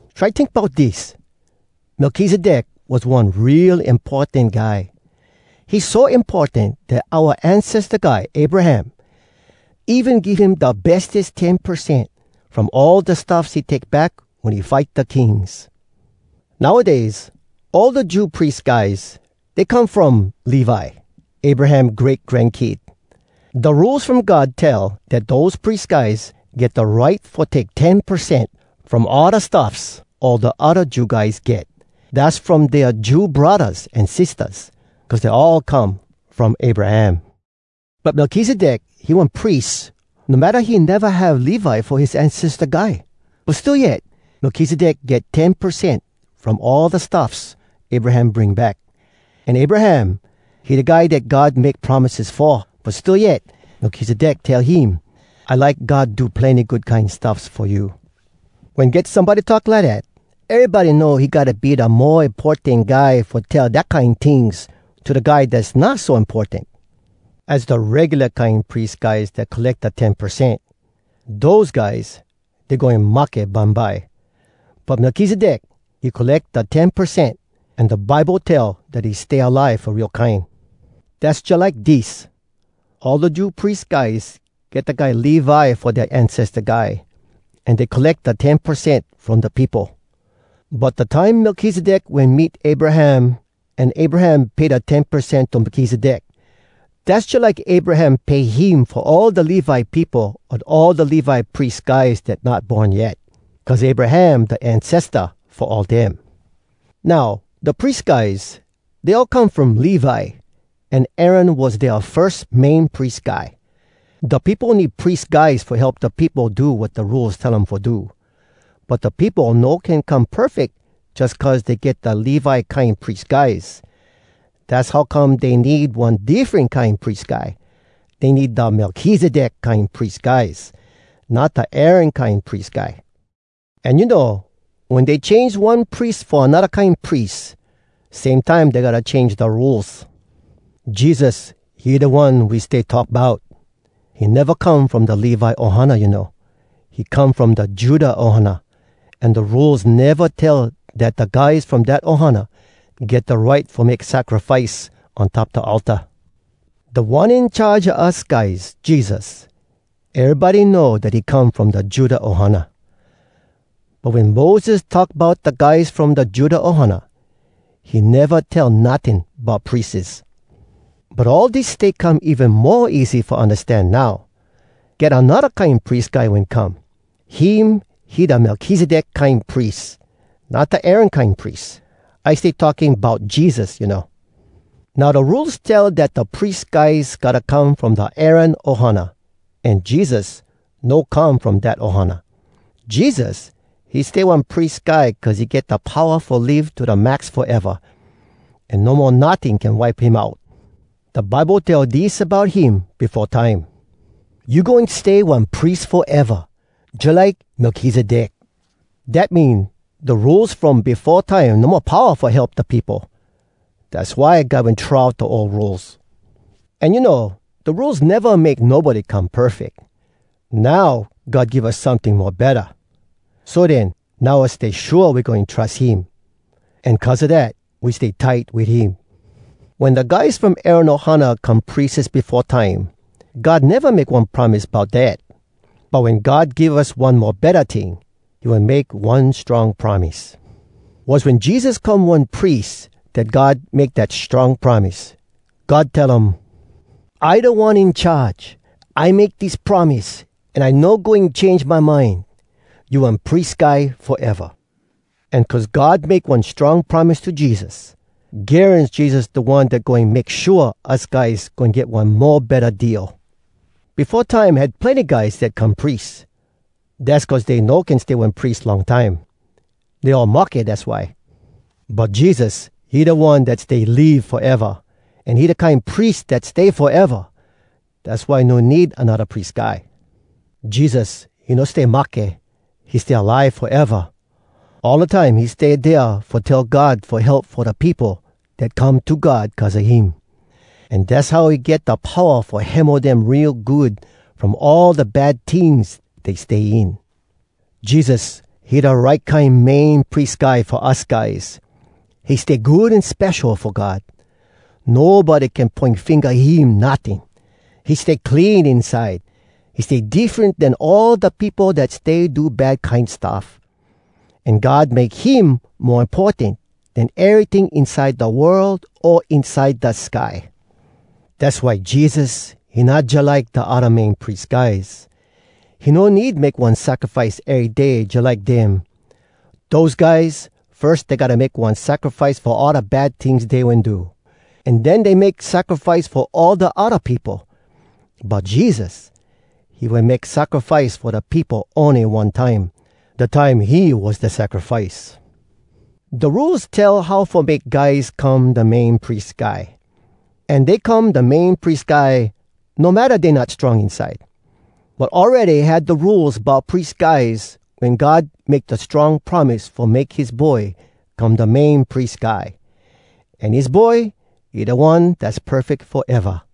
Try tink bout dis: Melkizedek was one real importan guy. He so importan dat oua ancesta guy, Abraham, even give him da bestes ten percent from all da stuffs he take back wen he fight da kings. Nowdays, all da Jew pries guys, dey come from Levi, Abraham great-grankid. Da Rules From God tell dat dose pries guys get da right fo take ten percent from all da stuffs all da odda Jew guys get—dass from dea Jew braddahs an sistahs, cuz dey all come from Abraham. But Melkizedek, he one pries, no matta he neva have Levi fo his ancesta guy. But still yet, Melkizedek get ten percent from all da stuffs Abraham bring back. An Abraham, he da guy dat God make promises fo, but still yet, Melkizedek tell him, “I like God do plenny good kine stuffs fo you.” Wen get somebody talk lidat, erybody know he gotta be da mo importan guy fo tell dat kine tings to da guy dass not so importan. Az da regula kine pries guys dat colleck da ten percent. Dose guys, dey goin mahke bumbye. But Melkizedek, he colleck da ten percent, an da Bible tell dat he stay alive fo real kine. Dass jalike dis: All da Jew pries guys get da guy Levi fo dea ancesta guy, an dey colleck da ten percent from da peopo. But da time Melkizedek wen meet Abraham an Abraham pay da ten percent to Melkizedek, dass jalike Abraham pay him fo all da Levi peopo an all da Levi pries guys dat not born yet, cuz Abraham da ancesta fo all dem. Now, da pries guys, dey all come from Levi, an Aaron was dea firs Main Pries Guy. Da peopo need pries guys fo help da peopo do wat da Rules tell um fo do. But da peopo no can come perfeck jus cuz dey get da Levi kine pries guys. Dass how come dey need one diffren kine pries guy. Dey need da Melkizedek kine pries guys, not da Aaron kine pries guy. An you know, wen dey change one pries fo anodda kine pries, same time dey gotta change da Rules. Jesus, he da One we stay talk bout. He neva come from da Levi ohana, you know. He come from da Judah ohana, an da Rules neva tell dat da guys from dat ohana get da right fo make sacrifice on top da altar. Da One In Charge a us guys, Jesus, erybody know dat he come from da Judah ohana. But wen Moses talk bout da guys from da Judah ohana, he neva tell notting bout prieses. But all dis stay come even mo easy fo undastan now: Get anodda kine pries guy wen come. Him, he da Melkizedek kine pries, not da Aaron kine pries. (I stay talking bout Jesus, you know.) Now da Rules tell dat da pries guys gotta come from da Aaron ohana, an Jesus no come from dat ohana. Jesus, he stay one pries guy cuz he get da powa fo live to da max foeva, an no mo notting can wipe him out. Da Bible tell dis bout him befo time: “You goin stay one pries foeva, Jalike Melkizedek.” Dat mean, da Rules from befo time no mo powa fo help da peopo. Dass why God wen throw out da ol rules. An you know, da Rules neva make nobody come perfeck. Now, God give us someting mo betta. So den, now us stay shua we goin trus him. An cuz a dat, we stay tight wit him. Wen da guys from Aaron ohana come prieses befo time, God neva make one promise bout dat. But wen God give us one mo betta ting, he wen make one strong promise. Was wen Jesus come one pries, dat God make dat strong promise. God tell um, “I Da One In Charge. I make dis promise, An I no goin change my mind. ‘You one pries guy foeva.’” An cuz God make one strong promise to Jesus, garans Jesus da One dat goin make shua us guys goin get one mo betta deal. Befo time had plenny guys dat come pries. Dass cuz dey no can stay one pries long time. Dey all mahke, dass why. But Jesus, he da One dat stay live foeva, an he da kine pries dat stay foeva. Dass why no need anodda pries guy. Jesus, he no stay mahke, he stay alive foeva. All da time he stay dea fo tell God fo help fo da peopo dat come to God cuz a him. An dass how he get da powa fo hemo dem real good from all da bad tings dey stay in. Jesus, he da right kine Main Pries Guy fo us guys: He stay good an spesho fo God. Nobody can poin finga him notting. He stay clean inside. He stay diffren den all da peopo dat stay do bad kine stuff. An God make him mo importan den eryting inside da world o inside da sky. Dass why Jesus, he not jalike da odda Main Pries guys. He no need make one sacrifice ery day jalike dem. Dose guys, firs dey gotta make one sacrifice fo all da bad tings dey wen do, an den dey make sacrifice fo all da odda peopo. But Jesus, he wen make sacrifice fo da peopo ony one time, da time he was da sacrifice. Da Rules tell how fo make guys come da Main Pries Guy. An dey come da Main Pries Guy no matta dey not strong inside. But awready had da Rules bout pries guys wen God make da strong promise fo make his Boy come da Main Pries Guy. An his Boy, he da One dass perfeck foeva.